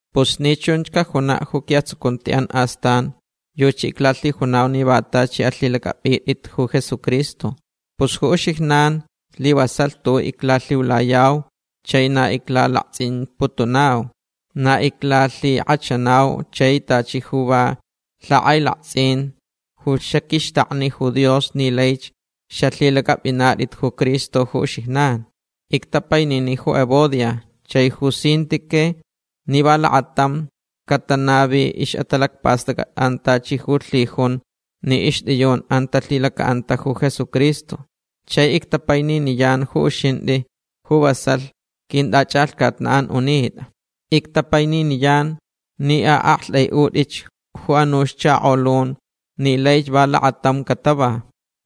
Pus ni chunch cajunaʼ ju quiʼatsucuntiʼan astan yuchi iclalhijunau ni va tachi alhilacʼapʼitʼit ju Jesucristo. Pus ju uxijnan slivasalh tuʼuʼ iclalhiulayau chai na iclalaktsʼimputunauch. Na iclalhikʼachanau chai tachi ju va lhakʼailaktsʼin ju xaqʼuixtakni ju Dios ni laich xalhilacʼapʼinatʼit ju Cristo ju uxijnan. Ictapainini ju Evodia chai ju Síntique ni va lakatamch catanavilh ixʼatalacpastʼacʼatʼan tachi ju lhijunch ni ixtʼiyunʼan talhilacaʼanta ju Jesucristo. Chai ictapaininiyan ju uxintʼi ju vasalh quintʼachʼalhcatnaʼ unitʼa. Ictapaininiyan ni aʼaktʼaiʼutʼich ju anuch chakolun ni laich va lakatam catava.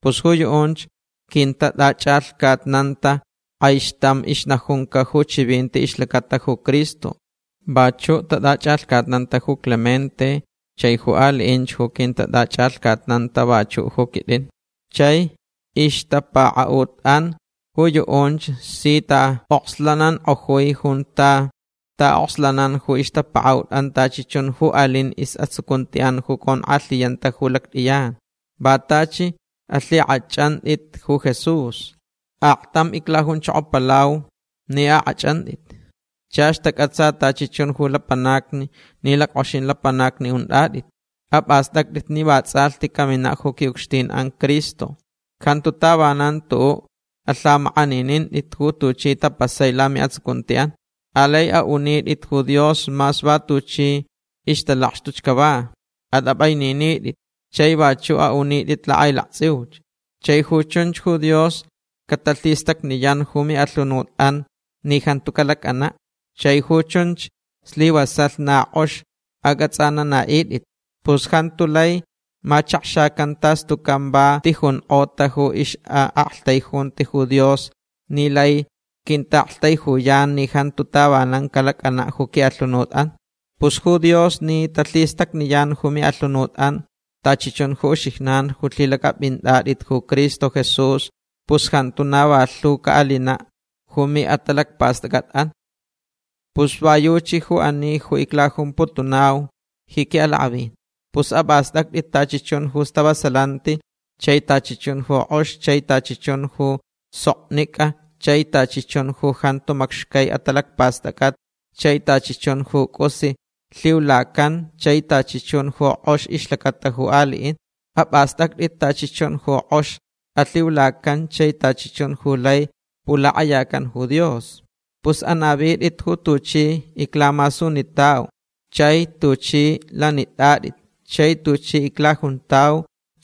Pus ju yuʼunch quintatʼachʼalhcatnanta kʼaixtam ixnajunca ju chivinti ixlacata ju Cristo. Vachuʼ tatʼachʼalhcatnanta ju Clemente chai ju aliʼinch ju quintatʼachʼalhcatnanta vachuʼ ju quitʼin. Chai ixtapakaʼutʼan ju yuʼunch si taʼokslanankʼojui junta taʼokslanan ju ixtapakaʼutʼan tachi chun ju alin isʼatsucuntiʼan ju conkʼalhiyanta ju lactʼiyan. Va tachi alhikʼachʼantʼit ju Jesús. Aktam iclajunchokopalau ni akʼachʼantʼitch. Chach tacʼatsa tachi chun ju lapanacni ni lackʼoxin lapanacni untʼatʼit. Apʼastʼactʼit ni va tsʼalhti caminaʼ ju quiʼucxtinʼan Cristo. Jantu tavanan tuʼuʼ alhamakʼaninintʼit ju tuchi tapasai lamiʼatsucuntiʼan. Alai aʼunitʼit ju Dios mas va tuchi ixtalakxtuch cava. Atʼapʼaininitʼit chai vachuʼ aʼunitʼit lakʼailaktsʼiuch. Chai ju chunch ju Dios catalhistacniyan ju miʼalhunutʼan ni jantu calacʼanaʼ. Chai ju chunch slivasalh na kʼox acʼatsʼananaʼitʼit. Pus jantu lai machakxacan tas tucan va ti jonkʼota ju ixʼaʼaktaijunti ju Dios ni lai quintaʼaktaijuyan ni jantu tavanan calacʼanaʼ ju quiʼalhunutʼan. Pus ju Dios ni talhistacniyan ju miʼalhunutʼan tachi chun ju uxijnan ju lhilacʼapʼintʼatʼit ju Cristo Jesús pus jantu na va lhu caʼalinaʼ ju miʼatalacpastʼacʼatʼan. Pus va yuchi ju ani ju iclajumputunau ji quiʼalakʼavin. Pus apʼastʼactʼit tachi chun ju stavasalanti chai tachi chun ju kʼox chai tachi chun ju soknicʼa chai tachi chun ju jantu macxcai atalacpastʼacʼat chai tachi chun ju cʼus alhiulacan chai tachi chun ju kʼox ixlacata ju aliʼin. Apʼastʼactʼit tachi chun ju kʼox alhiulacan chai tachi chun ju lai pulakʼayacan ju Dios. Pus anavitʼit ju tuchi iclamasunitauch chai tuchʼi lanitʼatʼit chai tuchi iclajuntau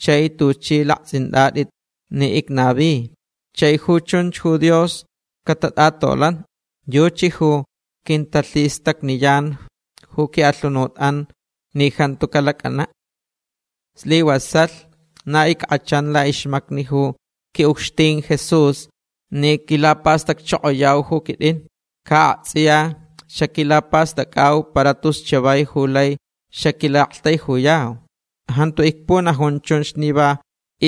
chai tuchʼi laktsʼintʼatʼit ni icnavich. Chai ju chunch ju Dios catatʼatolanch. Yuchi ju quintalhistacniyan ju quiʼalhunutʼan ni jantu calacʼanaʼ. Slivasalh na ickʼachan laʼixmacni ju quiʼucxtin Jesús ni quilapastacchokoyauch ju quitʼin. Ca aktsʼiya xaquilapastʼacʼauch para tus chavai ju lai xaquilaʼaktaijuyau. Jantu icpunajun chunch ni va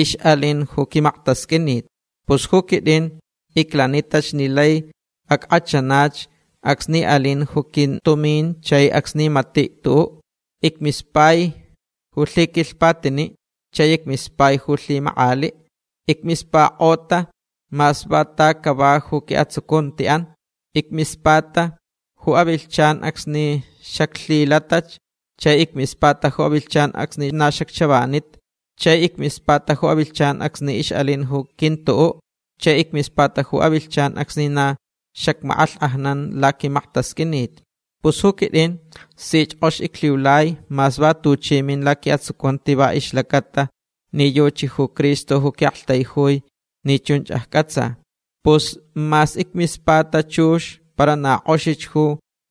ixʼalin ju quimaktasqʼuinit. Pus ju quitʼin iclanitach ni laich ackʼachanach acsni alinch ju quintumin chai acsni matich tuʼuʼ. Icmispai ju lhiquilhpatiniʼ chai icmispai ju lhimakʼaliʼ. Icmispakʼota mas va ta cava ju quiʼatsucuntiʼan. Icmispata ju avilhchan acsni xaclhilatach. Chai icmispata ju avilhchan acsni na xacchavanita. Chai icmispata ju avilhchan acsni ixʼalin ju quintuʼuʼ. Chai icmispata ju avilhchan acsni na xacmakʼalhkʼajnan laquimaktasqʼuinit. Pus ju quitʼin sich kʼox iclhiulai mas va tuchi min laquiʼatsucunti va ixlacaʼatalh ni yuchi ju Cristo ju quiʼaktaijui ni chunch accʼatsa. Pus mas icmispata chux para na kʼoxich ju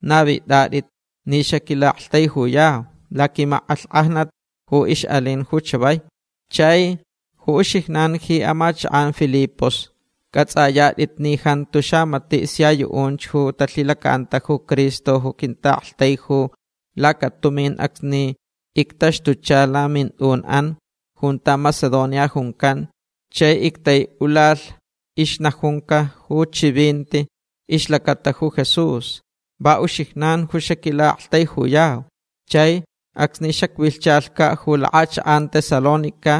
navitʼatʼit ni xaquilaʼaktaijuyau laquimakʼalhkʼajnat ju ixʼalin ju chavai. Chai ju uxijnan ji amachakʼan Filipos cʼatsʼayatʼit ni jantu xamatiʼ sia yuʼunch ju talhilacaʼanta ju Cristo ju quintaʼaktaiju lacatumin acsni ictaxtucha lamintʼunʼan junta Macedonia juncan chai ictaiʼulalh ixnajunca ju chivinti ixlacata ju Jesús. Va uxijnan ju xaquilaʼaktaijuyau. Chai acsni xacvilhchalhcaʼ ju lakʼachakʼan Tesalónica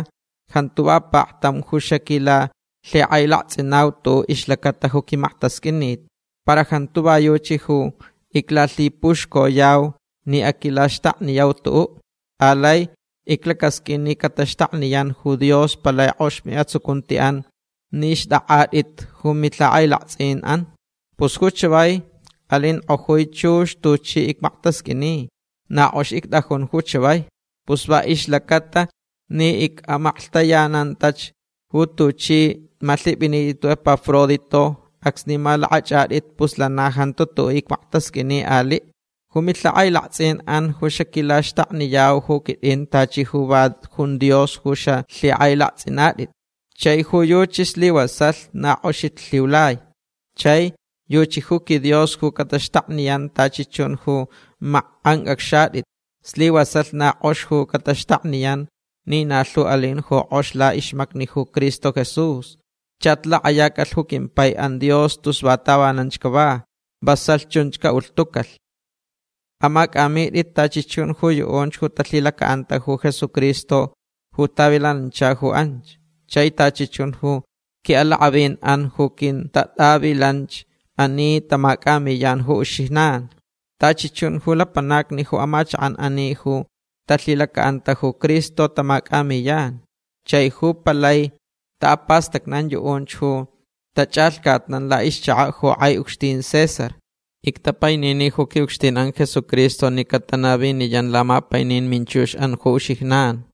jantu va paktam ju xaquilalhikʼailaktsʼinau tuʼuʼ ixlacata ju quimaktasqʼuinit. Para jantu va yuchi ju iclalhipuxcoyau ni aquilaxtakniyau tuʼuʼ. Alai iclacasqʼuin ni cataxtakniyan ju Dios palai kʼox miʼatsucuntiʼan ni xtʼakʼatʼit ju milhakʼailaktsʼinʼan. Pus ju chavai alinkʼojui chux tuchi icmaktasqʼuini. Na kʼox ictʼajun ju chavai. Pus va ixlacaʼatalh ni icʼamaklhtayanantach ju tuchʼi malhipʼinitʼit ju Epafrodito acsni malakʼachʼatʼit pus lana jantu tuʼuʼ icmaktasqʼuini aliʼ. Ju milhakʼailaktsʼinʼan ju xaquilaxtakniyau ju quitʼin tachi ju va jun Dios ju xalhikʼailaktsʼinatʼit. Chai ju yuchi slivasalh na kʼoxich lhiulai. Chai yuchi ju quiDios ju cataxtakniyan tachi chun ju makʼancʼacxatʼit. Slivasalh na kʼox ju cataxtakniyan ni na lhu alin ju kʼox laʼixmacni ju Cristo Jesús. Chach lakʼayacalh ju quimpaiʼan Dios tus va tavananch cava. Vasalh chunch caʼulhtucalh. Amacʼamitʼit tachi chun ju yuʼunch ju talhilacaʼanta ju Jesucristo ju tavilanancha ju anch. Chai tachi chun ju quiʼalakʼavinʼan ju quintatʼavilanch ani tamacʼamiyan ju uxijnan. Tachi chun ju lapanacni ju amachakʼan ani ju talhilacaʼanta ju Cristo tamacʼamiyan. Chai ju palai taʼapastacnan yuʼunch ju tachʼalhcatnan laʼixchakaʼ ju kʼai ucxtin César. Ictapainini ju quiʼucxtinʼan Jesucristo ni catanaviniyan lamapainin minchuxʼan ju uxijnan.